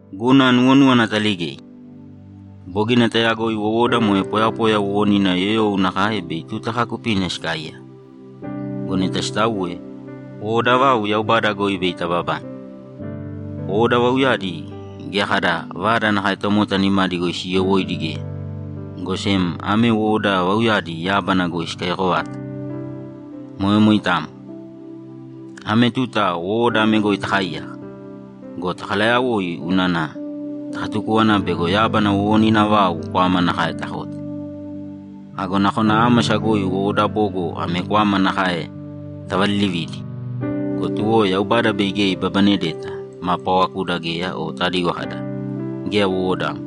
Guna nuwonúwana ataligei: Bogina tayagoi wowoda moe poyapoya wowonina yoyou nakae bei tuta kaakupina sikaaiyaka. Go neta sitauwe, wowoda vau Yaubada goi bei tababane. Wowoda vauyadi geya kada vada nakae tomota nimadi goi siiyowóidi geya, go sem ame wowoda vauyadi yábana goi sikaiyako vata. Moe moitamo. Ame tuta wowoda ame goi takaaiyaka go, takalayawoi unana takatukúwana bego yábana wowonina vau kwama nakae takote. Ago nakona ámasa goi wowoda bogo ame kwama nakae tavalilividi go, tuwo Yaubada bei geya ibabanedeta ma paawakuda geya o tadigo kada, ‘Geya wowodamo.’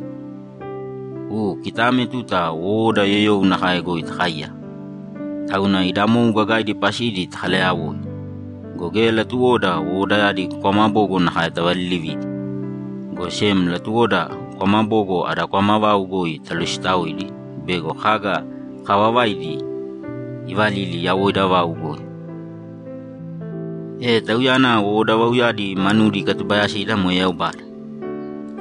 U, kita ame tuta wowoda yoyou nakae goi takaaiyaka, tauna ida mou gagaidi pasidi takalayawoi go, geya latuwoda wowodayadi kwama bogo nakae tavalilividi, go sem latuwoda kwama bogo ada kwama vau goi talositaoidi bego kaga kaavavaidi ivalili yawoida vau goi. E Tauyana wowoda vauyadi manudi ikatubayasida moe Yaubada.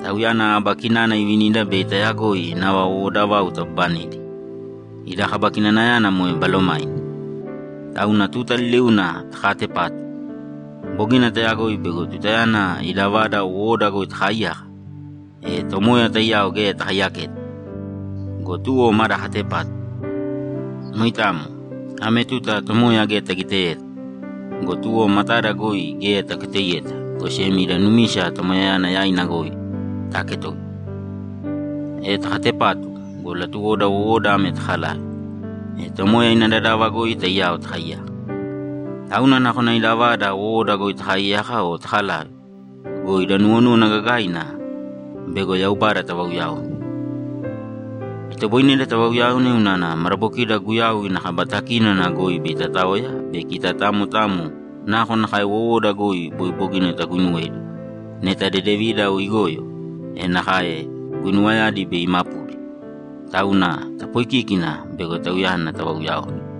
Tauyana aba kinana ivinida bei tayagoi nava wowoda vau tababanedi; ida kaba kinanayana moe Balomaina. Tauna tuta liliuna takaatepatu. Bogina tayagoi bego tutayana ida vada wowoda goi takaaiyaka, e Tomoya taiyao geya takaiyaketa go, tuwo maada katepatu. Moitamo. Ame tuta Tomoya geya tagiteyeta go, tuwo matada goi geya taketoiyeta, go sem ida numisa Tomoyayana yaina goi taaketoiya. E takatepatu go, latuwoda wowoda ame takalave, e Tomoya ina dadava goi taiyao takaiyaka. Tauna nakona ida vada wowoda goi takaiyaka o takalave go, ida nuwonúwana gagaina bego Yaubada tavauyaone. Itoboineda tavauyaone unana madabokida Guyau ina kaba takínona goi bei tataoya be kita tamo tamo nakonakae wowoda goi boi bogina taguinuwedi, neta dedevina o igoyo, e nakae guinuwayadi bei imapudi. Tauna tapoikīkina bego Tauyana tavauyaone.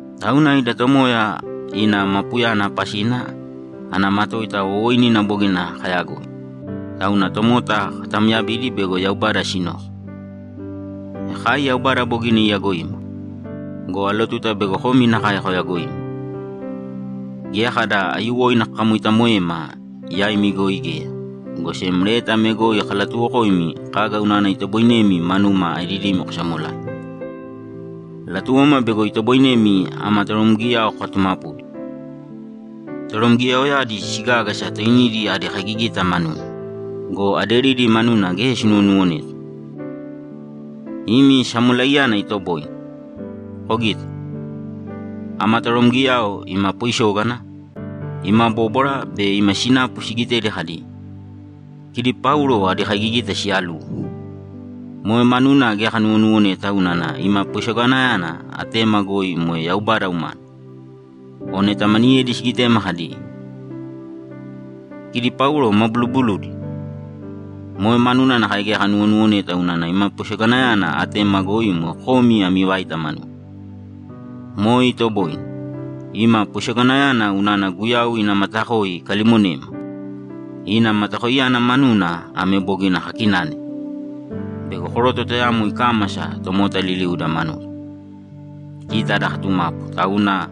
Tauna, ida Tomoya ina mapuyana pasina ana matoita wowooinina bogina kayagoi, tauna tomota katamyabidi bego Yaubada sinoko. E kai Yaubada bogina iyagoima. Go alotuta bego komi nakae koyagoima. Geya kada aiyuwoina kakamoitamoema yaimi goi geya, go sem leta ame goi kalatuuwokoimi kaga unana itoboinemi manuma aedidimi kosamolai. Latuwoma bego itoboinemi ama toromgiyao kokatumapudi. Toromgiyaoyadi sigágasa toinidi adi kaigigita manuna go, aderidi manuna geya sinuwonuwoneta. Imi samolaiyana itoboine. Kogita. Ama toromgiyao ima poisógana, ima bóbwara be ima sinapu sigitedi kadi, ‘Kidi Paulo adi kaigigita siyaluwo.’ Moe manuna geya kanuwonuwoneta unana ima poisoganayana atema goi moe Yaubada umana. O neta maniyedi sigitema kadi, ‘Kidi Paulo ma buluubuludi’, moe manuna nakae geya kanuwonuwoneta unana ima poisoganayana atema goi moe komi ami vaita manuna. Moe itoboine. Ima poisoganayana unana Guyau ina matakoi ikalimonema. Ina matakoiyana manuna ame bogina kakinane: Bego koroto tayamo ikámasa tomota liliuda manuda, kita ada katumapu, tauna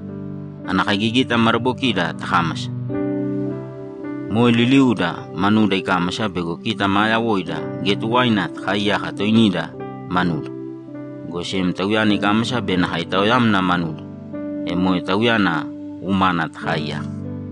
ana kaigigita madabokida takámasa. Moe liliuuda manuda ikámasa bego kita maa yawoida geya tuwaina takaaiyaka toinida manuda, go sem Tauyana ikámasa be nakae itaoyamna manuda, e moe Tauyana umana takaaiyaka.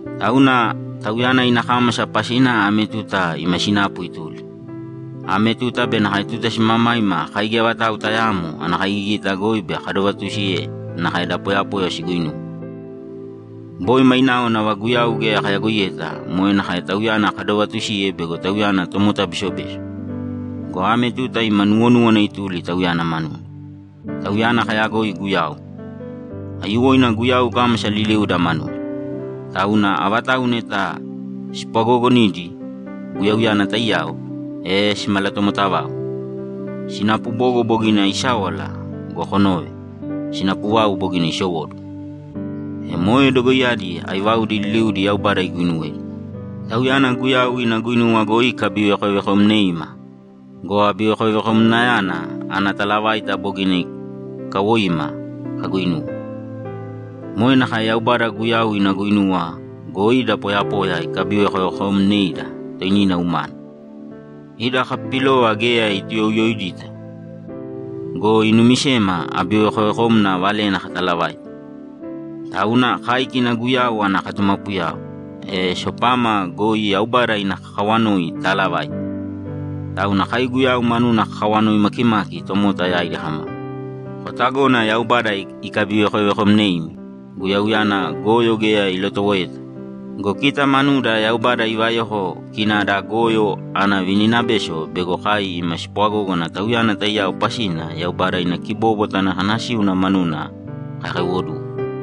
Tauna Tauyana ina kámasa pasina ame tuta ima sinapu ituli. Ame tuta be nakae tuta simamaima kai geya vatau tayaamo ana kaigigita goi bei kadovatusiye nakae da poyapoya siguinuwe. Boi mainao nava Guyau geya kayagoiyeta moe nakae Tauyana kadovatusiye bego Tauyana tomota besobeso go, ame tuta ima nuwonúwana ituli Tauyana manuna. Tauyana kayagoi Guyau. Aiyuwoina Guyau ikámasa liliuda manuda, tauna avatauwa neta spwagoogonidi Guyauyana taiyao, e simalatomotavau. Sinapu bogo bogina isáwala go, konōve, sinapu vau bogina isowóduwo! E moe dogoiyadi aivaudi liliudi Yaubada iguuinuwedi. Tauyana Guyau ina guinuwa goi ikabivekovekomneima go, abivekovekomnayana ana talavaita bogina ikawoima kaguinuwe. Moe nakae Yaubada Guyau ina guinuwa goi da poyapoya ikabivekoveekomneida toinina umana, ida kapipilova geya ituuyouyoidita go, inumisema abivekovekomna valena katalavaite. Tauna kai kina Guyau ana katumapuyao, e sopama goi Yaubada ina kawanoi itaalavaite. Tauna kai Guyau manuna kakawanoi makimaki tomota yaidi kama, ‘Kotagōna Yaubada ikabivekovekomneimi.’ Guyauyana goyo geya ilotowoeta go, kita manuda Yaubada ivayoko kina ada kimavada ana vininabeso bego kai ima spwagógana Tauyana taiyao pasina Yaubada ina kibóbwata ana kanasíuna manuna kakaiwoduwe.